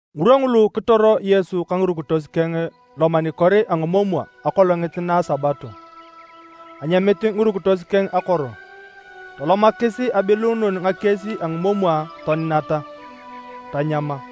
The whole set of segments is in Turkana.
Ngirwa ngulu kitoro Yesu ka ngirukitos keng lomanikor a ngimomwa akolongit na Sabato. Anyamit ngirukitos keng akoro, tolomakis abiluunun ngakies a ngimomwa toninata, tanyama.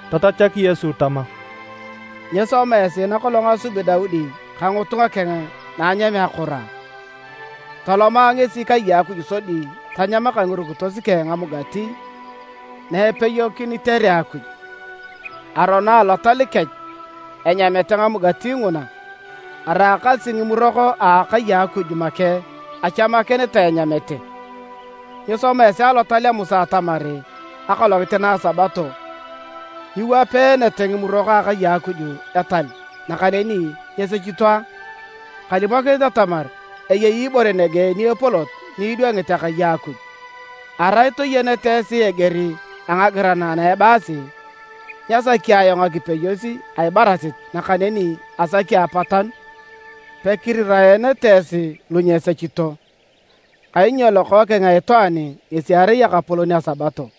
Tatachak Yesu tama, “Nyisoma esi nakolong asubi Daudi ka ngitunga keng na anyamea akoro a? Toloma ngesi kai a Akuj sodi tanyama ka ngirukitos keng ngamugati na epeyokinitere Akuj. Arono Alotal kech enyamete ngamugati nguna, araakasi ngimurok a akai a Akuj make achamakinitae enyamete. Nyisoma esi Alotal a Musa atamar akolongit na Sabato nyiwapeenete ngimurok a akai a Akuj etal, nakaneni nyesechito a? Kalimokinit atamar eyei ibore nege ni epolot ni idwangit akai a Akuj. Arai toyenete esi eger a ngagiran ana ebaasi, ‘Nyasaki ayong ngakipeyos a ibarasit nakaneni asaki apatanu’, pekiriraenete esi lu nyesechito. Kainyo Lokookeng a Itwaan ngesi erai Ekapolon a Sabato.”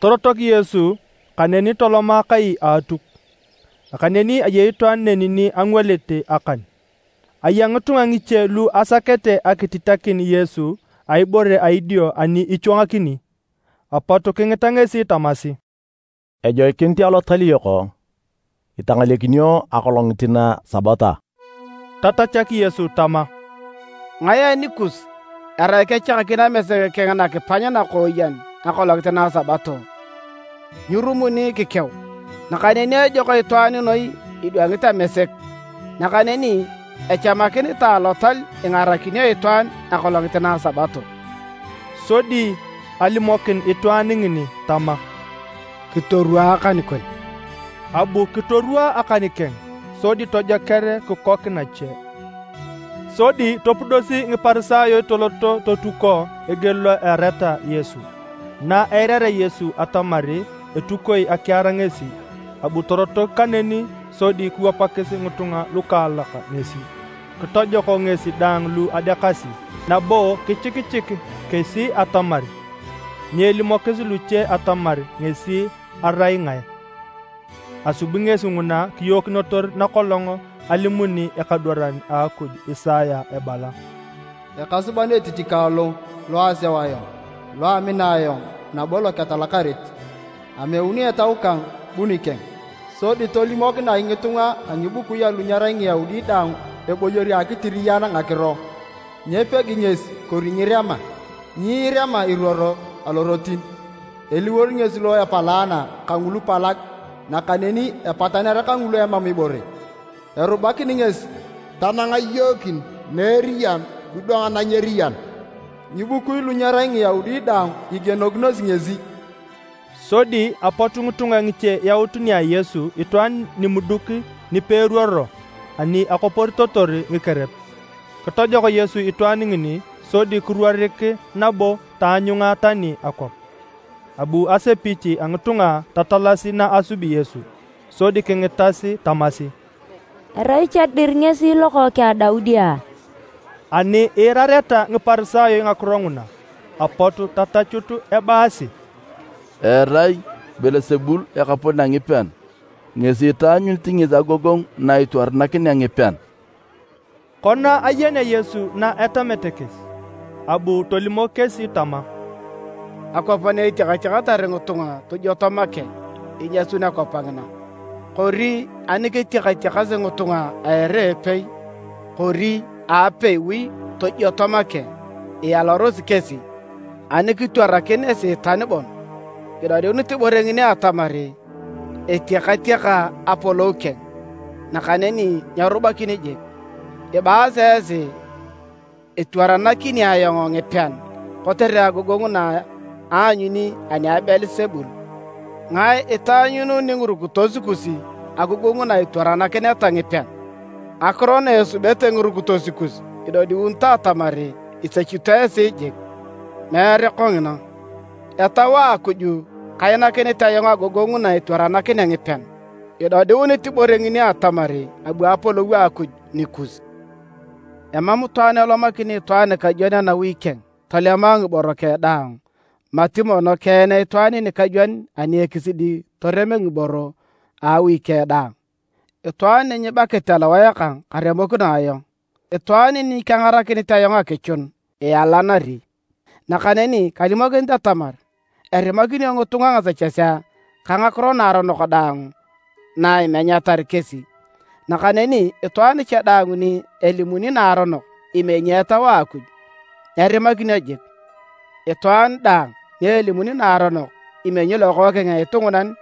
Torotok Yesu kaneni toloma kai a Atuk. Nakaneni ayei itwaan neni ni angwalit akan. Aya ngitunga ngiche lu asakete akititakin Yesu a ibore a idio ani ichwangakini, apot kingita ngesi tamasi, “Ejoikinit alotal yok itangalekinio akolongit na Sabato a?” Tatachak Yesu tama, “Ngae anikus erai ani kechakakin amesek keng nakipany nakooyen akolongit na Sabato, nyirumuni kikeu? Nakaneni ejok itwaan noi idwangit amesek! Nakaneni echamakinitae alotal ingarakinio itwaan akolongit na Sabato.” Sodi alimokin itwaan ngini tama, “Kitorwaa akan kon.” Abu kitorwaa akan keng sodi tojoker kikok nache. Sodi topudosi Ngiparisayo toloto totuko eger lo eareta Yesu. Na eirarea Yesu atamar etukitoe akiar ngesi, abu torotok kaneni sodi kiwapakis ngitunga lukaalak ngesi. Kitojok ngesi daang lu adeakasi nabo kichikichik kesi atamar nyeelimokis luche atamar ngesi erai ngae. Asubi ngesi nguna kiyookinotor nakolong alimuni ekadwaran a Akuj Isaya ebala: “Ekasuban etich kang lo, lo aseu ayong, lo amina ayong, nabo lo ketalakarit. Ameuni Etau kang bu nikeng. Sodi tolimokinea ngitunga a ngibukui alu nyerai Ngiyaudi daang eboyor a akitiriyan ngakiro. Nyepegi ngesi kori nyirema. Nyiirema iruoro alorotin. Eliwor ngesi lo epalaana kangulu palag nakaneni epataner kangulu emam ibore. Erubakini ngesi tanang iyookin na eriyan kidwanga na nyeriyan. Ngibukui lu nyerai Ngiyaudi daang, igienosi ngesi.” Sodi apot ngitunga ngiche yaut nia Yesu itwaan nimuduk nipeeruoro ani akoporitotor ngikerep. Kitojok Yesu itwaan ngini sodi kiruorik nabo taanyunga tani akwap. Abu asepich a ngitunga tatalasi na asubi Yesu. Sodi kingitas tamasi, “Erai cha dir ngesi lokookeng a Daudi a?” Ani iirareta Ngiparisayo ngakiro nguna, apot tatachut ebaasi, “Erai Beelsebul ekapolon a ngipean ngesi itaanyunit ngesi agogongu na itwaranakinea ngipean.” Kona ayenea Yesu na etamete kesi, abu tolimok kesi tama, “Akwap na etiakatiakatar ngitunga tojwoto make, inyasun akwap ngina. Kori ani ketiakatiakasi ngitunga a ere a epei kori a apeiwi tojioto make, ialarosi kesi. Ani kitwarakin Esiitan bon, idodiunit ibore ngini atamar etiakatiaka apolou keng, nakaneni nyerubakini jik. Ibaasi esi etwaranakini ayong ngipean kotere agogongu na aanyuni ani a Beelsebul. Ngae itaanyuununi ngirukitos kus agogongu na itwaranakineta ngipean? Ngakiro na esubete ngirukitos kus idodiunito atamar isechito esi jik. Meere kongina. Etau a Akuj kainakinit ayong agogongu na etwarakinea ngipean, idodiunit ibore ngini atamar abu Apolou a Akuj nikus. “Emam itwaan elomakini itwaan nikajwon anawi keng, tolema ngiboro keng daang mati mono keen itwaan nikajwon ani ekisidi torem ngiboro a awi keng daang. “Itwaan ni nyibakit alowae kang karemokino ayong. Itwaan ni nyekengarakinit ayong akichun, ialanari, nakaneni kalimokinit atamar erimakinio ngitunga ngasechesea ka ngakiro naaronok daang na imenyatar kesi, nakaneni itwaan cha daang ni elimuni naaronok imenyi Etau a Akuj, nyerimakinio jik. Itwaan daang ni elimuni naaronok imenyi Lokookeng a Itwaan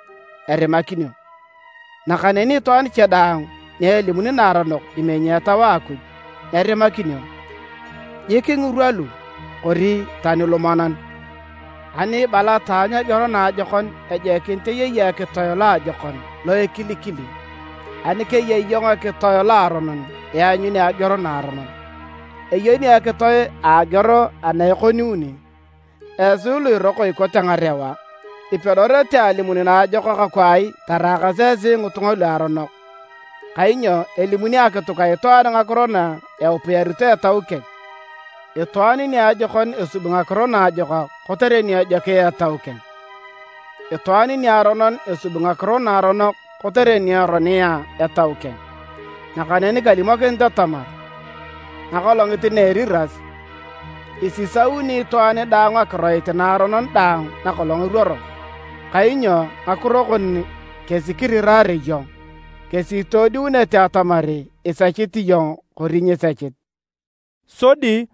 erimakinio, nakaneni itwaan cha daang ni elimuni naaronok imenyi Etau a Akuj nyerimakinio, jik ngirwa lu, kori tani lumonan. “Ani ibala taanyu ageor naajokon ejoikinit eyei ekitoe loajokon lo ekilikili. Ani keyei iyong ekitoe loaronon ianyuni ageor naaronon. Eyenio ekitoe a ageor ana ekoniuni. Esi lu iroko ikote ngarewa! Ipedorete alimun naajokak kwai taraakas esi ngitunga luaronok? Kainyo elimuni akituk a itwaan ngakiro na eupiyarito etau keng. Itwaan niajokon esubi ngakiro naajokak kotere ni ejokia etau keng. Itwaan niaronon esubi ngakiro naaronok kotere ni eronia etau keng. “Nakaneni kalimokinit atamar, akolongit na eriras, isisauni itwaan daang akiroit naaronon daang nakolong eruoro. Kainyo ngakiro kon kesi kiriraare iyong, kesi itodiunete atamar isechit iyong kori nyisechit.” Sodi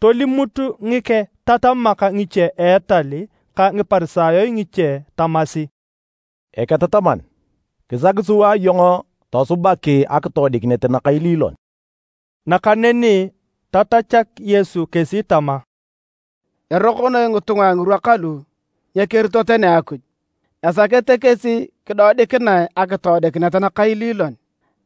tolimut ngiketatamak ngiche a etal ka Ngiparisayo ngiche tamasi, “Eketataman, kisaki sua iyong tosubak akitoodikinet nakailiilon.” Nakaneni tatachak Yesu kesi tama, “Eroko noi ngitunga a ngirwa kalu nyekerito tani Akuj. Esakete kesi kidodikinae akitoodikinet nakailiilon.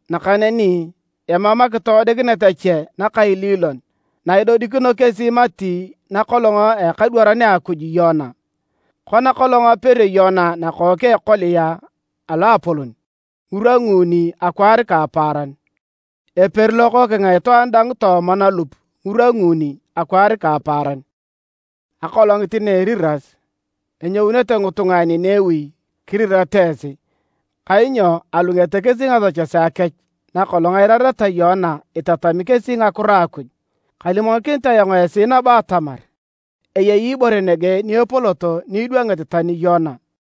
Nakaneni emam akitoodikinet ache nakailiilon na idodikinio kesi mati nakolong a ekadwaran a Akuj Yona. Kona kolong aperio Yona nakook a ekolia a loapolon ngirwa nguuni akwaar ka apaaran, eperi Lokookeng a Itwaan dang tooma nalup ngirwa nguuni akwaar ka apaaran. Akolongit na a eriras, enyounete ngitunga a Ninewi kirirata esi, kainyo alungete kesi ngasechesea kech na kolong eirareta Yona itatami kesi ngakiro a Akuj. Kalimokinit ayong esi nabo atamar, eyei ibore nege ni epolot ni idwangit tani Yona.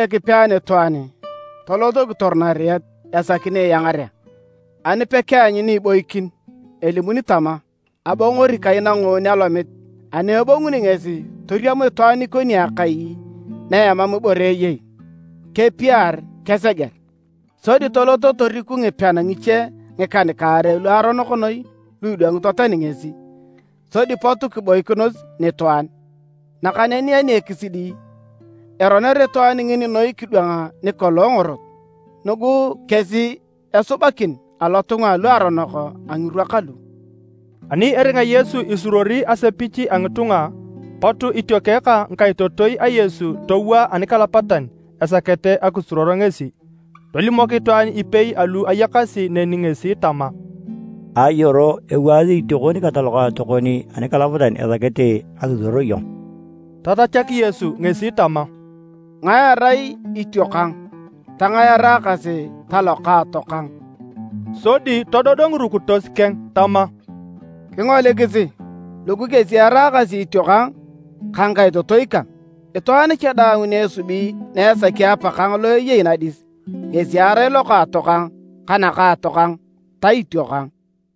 “Naepudorea Ekipe anitwaan, tolot kitor nariet esaki ni iangarea. Ani pekeanyu ni iboikin, elimuni tama, ‘Abongori kai na ngoon alomit’. Ani ebonguni ngesi toriam itwaan ikoni akai na emam ibore eyei, kepiar keseger. Sodi tolot toriku ngipean ngiche ngikan-kaarei luaronok noi lu idwangito tani ngesi, sodi pot kiboikinos nitwaan. Nakaneni ani ekisidi, eroner itwaan ngini noi kidwang ni kolong ngorot. Nugu kesi esubakin alotunga aluaronok a ngirwa kalu.” Ani eringa Yesu isuruori asepich a ngitunga, pot itiokeng ka ngikaitotoi a Yesu. Towaa anikalapatan esakete akisuruor ngesi. Tolimok itwaan ipei alu ayakasi neni ngesi tama, “Ayoro, ewaasi itiokon ka talokaatokon anikalapatan esakete akisuruor iyong.” Tatachak Yesu ngesi tama, “Ngae erai itiokang? Tangae eraakasi talokaatokang?” Sodi todod ngirukitos keng tama, “Kingolikisi! Lugu kesi eraakasi itiokang ka ngikaitotoi kang. Itwaan cha daang ni esubi na esaki Apakang lo eyei nadis, ngesi erai lokaatokang ka nakaatokang ta itiokang.”